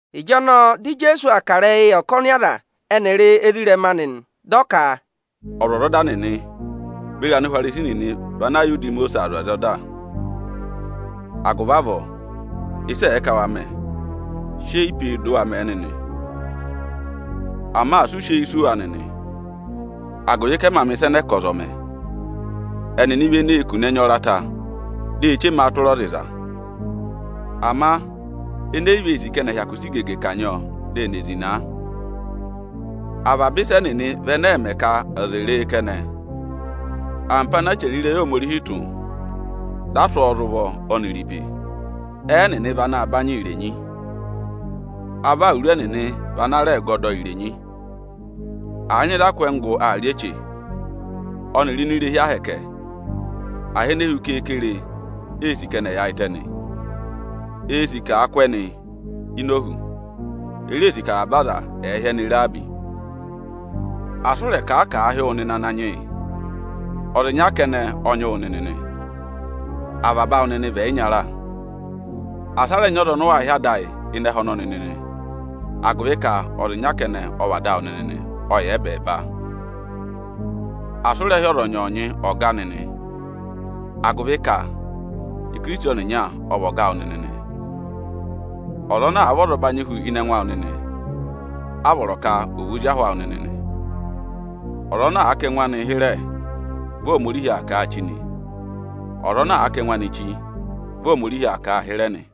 Ịjọnọọ dị Ijeesu aa kà ịrẹyịị yị ọkọnị aza ẹnịrị ezirẹma anị nị. Dị ọ ka, “Ọzwọzọda nịnị beri Anihwarisi nịnị vị ana yà udi Imosiisi aa zụ̀ aza ọda. Agụvị avọọ ịsị ẹ̀ẹ ka wa mẹ, sị eyi pe e dị ụ waa mẹ̀ ẹ nịnị! Ama asị u sị eyi sì wa nịnị, agụvị ka ẹ mā mẹ̀ ịsa ẹnẹẹ ka ọza ọ̀ mẹ. Ẹnịnị vị eneē kune ẹnya ọrata, di e chema a tụra ọza ịza; ama ẹnị e yi vee sì ka ẹnị ẹ̀ hyakụ sị igege kanyị ọ, dị ẹnị è zịna a. Avaba ịsa ẹnịnị vị ẹnẹ ẹẹ̄ mẹ ka aza è re e kẹnẹ. Ampo ana a chẹrẹ ịrẹyị Ohomorihi tụ́, dị a sụ́ ọ za ụvọ ọnịrị ibe, ẹnịnị vị ana banyị irenyi. Avọ awuru ẹnịnị vị ana rẹ gọdọ irenyi. Àa nyị ịzị a kụ́ ẹngụ gụ aa rị eche, ọnịrị ini irehi ahẹkẹ Aniju, aha ene hu keekere eē sì ka ẹnị ẹ̀ yaayịtẹ nị. Eē sì ka àa kụ́ ẹnị ini ohu. E reē sì ka avaba aza ẹ̀ẹ hị́ ẹnị Ọga. Asị ụ rẹ̀ kà a ka àa hị́ wụ nịnị ‘Ananyị yị’! Ọza ịnya kẹnẹ ọ nyị wụ nịnị nị. Avaba awụ nịnị vị ẹyịnyara. Asị a rẹ nyị ọza ọnị ụ waa hị́ ‘Ada ayị’ ịnị ẹhẹ ọnọnị nịnị, agụvị ka ọza ịnya kẹnẹ ọ vị Ada awụ nịnị; ọ yà ẹbẹẹba. Asị ụ rẹ hị́ ọza ọnyọọnyị ‘Ọga’ nịnị! agụvị ka Ikirisiti ọnịnya ọ vị ọga awụ nịnị nị. Ọza ana àa vị ọzọbanyị hu ịnị ẹngụ awụ nịnị, a vọrọ ka ọ̀ vị ozi ahụ awụ nịnị nị. Ọza ana àa kà ẹngụ anị hịrẹ, vị Ohomorihi aa kà a chí nị, ọza ana àa kà ẹngụ anị chí, vị Ohomorihi aa kà a hịrẹ nị.”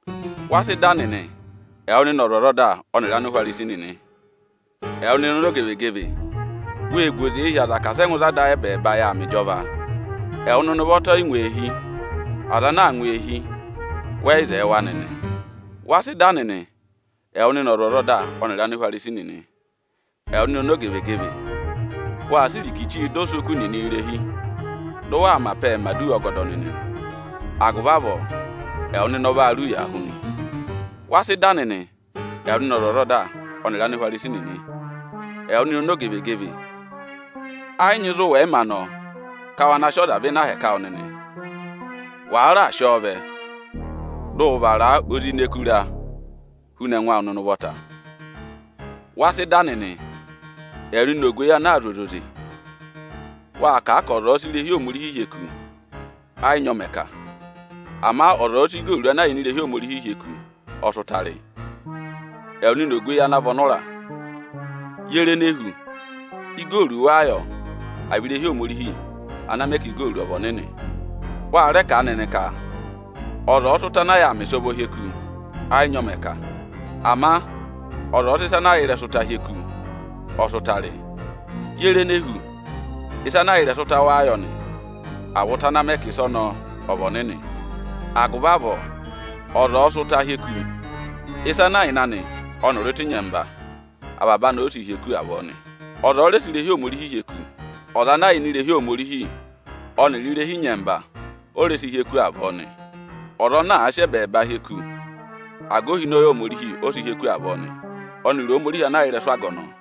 “Wa sị dà nịnị, ẹwụ nịnị ọzwọzọda ọnịrị Anihwarisi nịnị. Ẹwụ nịnị ọmọzakụyẹ! Wee gu oze hi aza ka asị ẹ ngụ ịzị Ada ayị ẹbẹẹba yà aa mẹ ịjọva. Ẹwụ nịnị ụvọta ọ yị ngụ eehi, aza ana aa ngụ eehi, wẹ yị zẹẹ wa nịnị. [Wa sị dà nịnị. Ẹwụ nịnị ọzwọzọda ọnịrị Anihwarisi nịnị. Ẹwụ nịnị ọmọzakụyẹ! Waa sị irikichii dọ osoku nịnị irehi, dị ụ waa mẹ apẹẹ mẹ̀ aduwa ọgọdọ nịnị; agụvị avọọ ẹwụ nịnị ọ vaa rị ụyaa hu nị.] Wa sị dà nịnị. Ẹwụ nịnị ọzwọzọda ọnịrị Anihwarisi nịnị. Ẹwụ nịnị ọmọzakụyẹ! Ẹ yị nyị ịzị ụ wẹ̀ yị mā nọ ka wa na sị ọza vẹ ịnị ahẹkẹ awụ nịnị. Wàa raà sị ọọ vẹ, dị ụ vara a ozi ini ẹkụra huna ẹngụ awụ nịnị ụvọta. Wa sị dà nịnị, ẹwụ nịnị ogweyi ana aa zụ̀ ọza oze. Waa kà a ka ọza ọ̀ọ sị irehi Ohomorihi hyeku, ẹ yị nyị ọ mẹ̀ ka. Ama ọza ọ̀ọ sị igooru ana yà ini irehi Ohomorihi hyeku ọ sị ụta rị. Ẹwụ nịnị ogweyi ana vị ọnụra! Ye re ene hu? Igooru wáá yọ, à vị irehi Ohomorihi ana mẹ ka igooru ọnọọ ọ̀ vị ọnịnị? Wa rẹ kà a nịnị ka: ‘Ọza ọ̀ọ sị ụta anaa yàā mẹ ịsọvọọ hyeku, ẹ yị nyị ọ mẹ̀ kà. Ama ọza ọ̀ọ sị ịsa ana yà ịrẹsụ ụta hyeku, ọ sị ụta rị.’ Ye re ene hu? Ịsa ana yà ịrẹsụ ụta wáá yọ nị, à vị ụta ana mẹ ka ịsa ọnọọ ọ̀ vị ọnịnị? Agụvị avọọ, ọza ọ̀ọ sị ụta hyeku, ịsa ana yà ịnị anị ọnịrị ụta ịnyẹmba, avaba anị ọ sị hyeku avọọ nị. Ọza ọ̀ọ rẹ sị irehi Ohomorihi hyeku, ọza ana yà ini irehi Ohomorihi ọnịrị irehi ịnyẹmba, ọ rẹ sị hyeku avọọ nị. Ọza ana àa sị ẹbẹẹba hyeku, aga ohinọyị Ohomorihi ọ sị hyeku avọọ nị, ọnịrị Ohomorihi ana yà ịrẹsụ aga ọnọọ.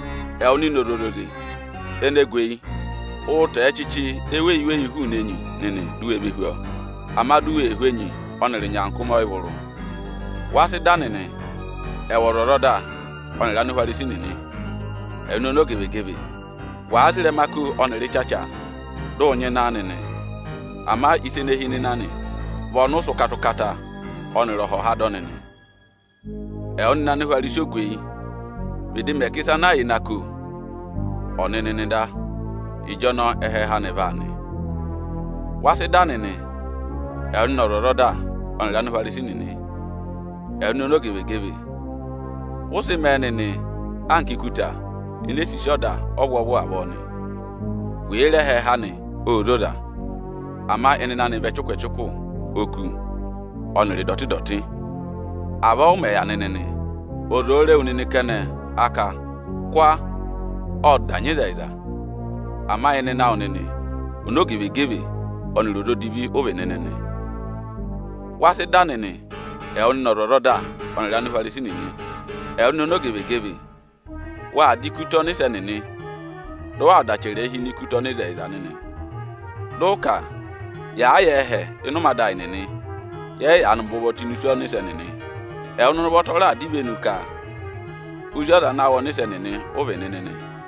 Ẹwụ nịnị ọzwọzoze ene gu eyi, ụụ̄ tọ̀ọ́ ẹchịchị eweyi-eweyi hụụnị enyi nịnị di u we ve hú ọọ, ama di u wee hú enyi ọnịrị ịnyaakụmị ọyịvụrụ! Wa sị dà nịnị, ẹwụ ọzwọzọda ọnịrị Anihwarisi nịnị, ẹwụ nịnị ọmọzakụyẹ! Wàa za ịrẹma ako ọnịrị ịchacha, dị ụ nyịna wa nịnị; ama ịsa ene hi ịnịnẹ anị vị ọnị ụ sị ụkata-ụkata ọnịrị ọhọha dọ nịnị. Ẹwụ nịnị Anihwarisi ogweyi, vịdị mẹ ka ịsa ana yà ịnị ako ọ̀ nị nịnị da, ịjọnọọ ẹhẹẹhẹ anị vaa nị. Wa sị dà nịnị, ẹwụ nịnị ọzwọzọda ọnịrị Anihwarisi nịnị. Ẹwụ nịnị ọmọzakụyẹ! Vị ụ sị mẹẹ nịnị anka ikuta enee sisi ọda ọvwọọvụ avọọ nị. Wèe re ẹhẹẹhẹ anị, ô zoza; ama ịnịnẹ vị ẹchụkụ-ẹchụkụ oku ọnịrị ịdọtị-ịdọtị. Avọọ ụ mẹ̀ yà nịnị nị; ọza òo re wu nịnị kẹnẹ, a ka: ‘Kwa! Ộ da nyị ịzẹyịza’, ama ịnịnẹ awụ nịnị, ọmọzakụyẹ ọnịrị ọza odivi ụ vị nịnị nị. Wa sị dà nịnị, ẹwụ nịnị ọzwọzọda ọnịrị Anihwarisi nịnị. Ẹwụ nịnị ọmọzakụyẹ! Waa dà ikuta ọnịsẹ nịnị, dị ụ dà achẹrẹ hi ini ikuta ọnịzẹyịza nịnị, dị ụ ka: ‘Yàa yà ẹhẹ ịnị ụmẹ ada ayị nịnị, yẹ yị yaanị bẹ ụvọ tụ́ ini isu ọnịsẹ nịnị.’ Ẹwụ nịnị ụvọta ọ raà dọ ivenu ka ozi aza ana wụ ọnịsẹ nịnị ụ vị nịnị nị.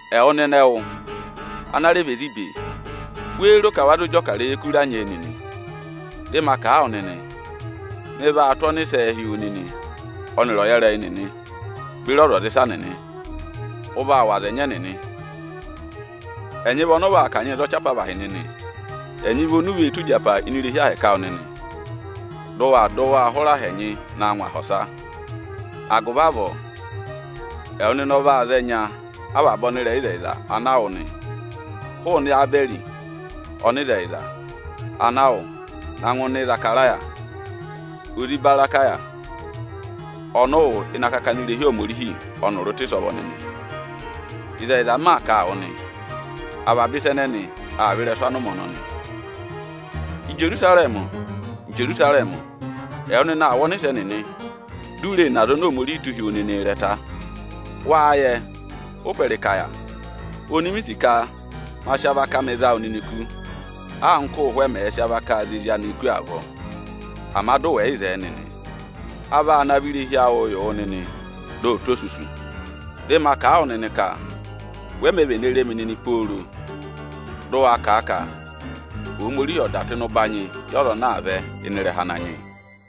Ẹwụ nịnị ẹwụ ana rẹ vị ezi ibe, wéé ro ka wa zụ jị ọkarẹyị ẹkụra nyee nịnị? Dị ma kà a wụ nịnị, mị vaa tụ́ ọnịsẹẹ hi wu nịnị ọnịrị ọyẹrẹyị nịnị beri ọzwọzịsa nịnị, ụ vaa wụ̀ aza ẹnyị ẹnịnị, ẹnyị vị ọnị ụ vaa kanyịị za ọchị apavahị nịnị, ẹnyị vị oni u vee tụ́ ịjapa ini irehi ahẹkẹ Aniju awụ nịnị, dị ụ waa dị waa hụrẹ aha ẹnyị naa ngụ aha ọsa. Ịtọ 24.20,21Agụvị avọọ ịrẹsụ ẹwụ nịnị anya avaba ọnịrẹyịzẹyịza ana a wụ̀ aa vẹ nị, hụụnị Ebẹrị ọnịzẹyịza ana a wụ̀ na ngụ usu Ịzakaraya, ozi Ibarakaya ọnị ụ wụ ịnị akakana irehi Ohomorihi ọnịrị ụta ịsọvọ nịnị. Ịzẹyịza m maa kà a wụ nịnị nị, avaba ịsa ẹnẹnị aa vẹ ịrẹsụ anụmẹ ọnọnị.” “Ijerusarẹmị! Ijerusarẹmị! Ẹwụ nịnị aa wụ ọnịsẹ nịnị, di u ree ne aza oni Ohomorihi tụ́ hi wu nịnịị ịrẹta nị. Wáá yẹ ụ́pẹ ịrịka yà oni mi sì ka ma sị avaka amị za wụ nịnị kú, anka ụ́ụhwẹ mẹ̀ẹ̄ sị avakaa za ezi anịị kú avọọ, ama dị ụ wẹ yị zẹẹ nịnị. A vaa navọ irehi awụụ yị wụ nịnị, dị ọ tụ́ osusu. Dị ma kà a wụ nịnị ka we mē vene re mi nịnị pooro dị ụ waa kà a ka: ‘Ohomorihi ọ̀ dà tụ́ ịnị ụbanyị yị ọza ana aa vẹ ịnị ịrẹha Ananyị yị!’”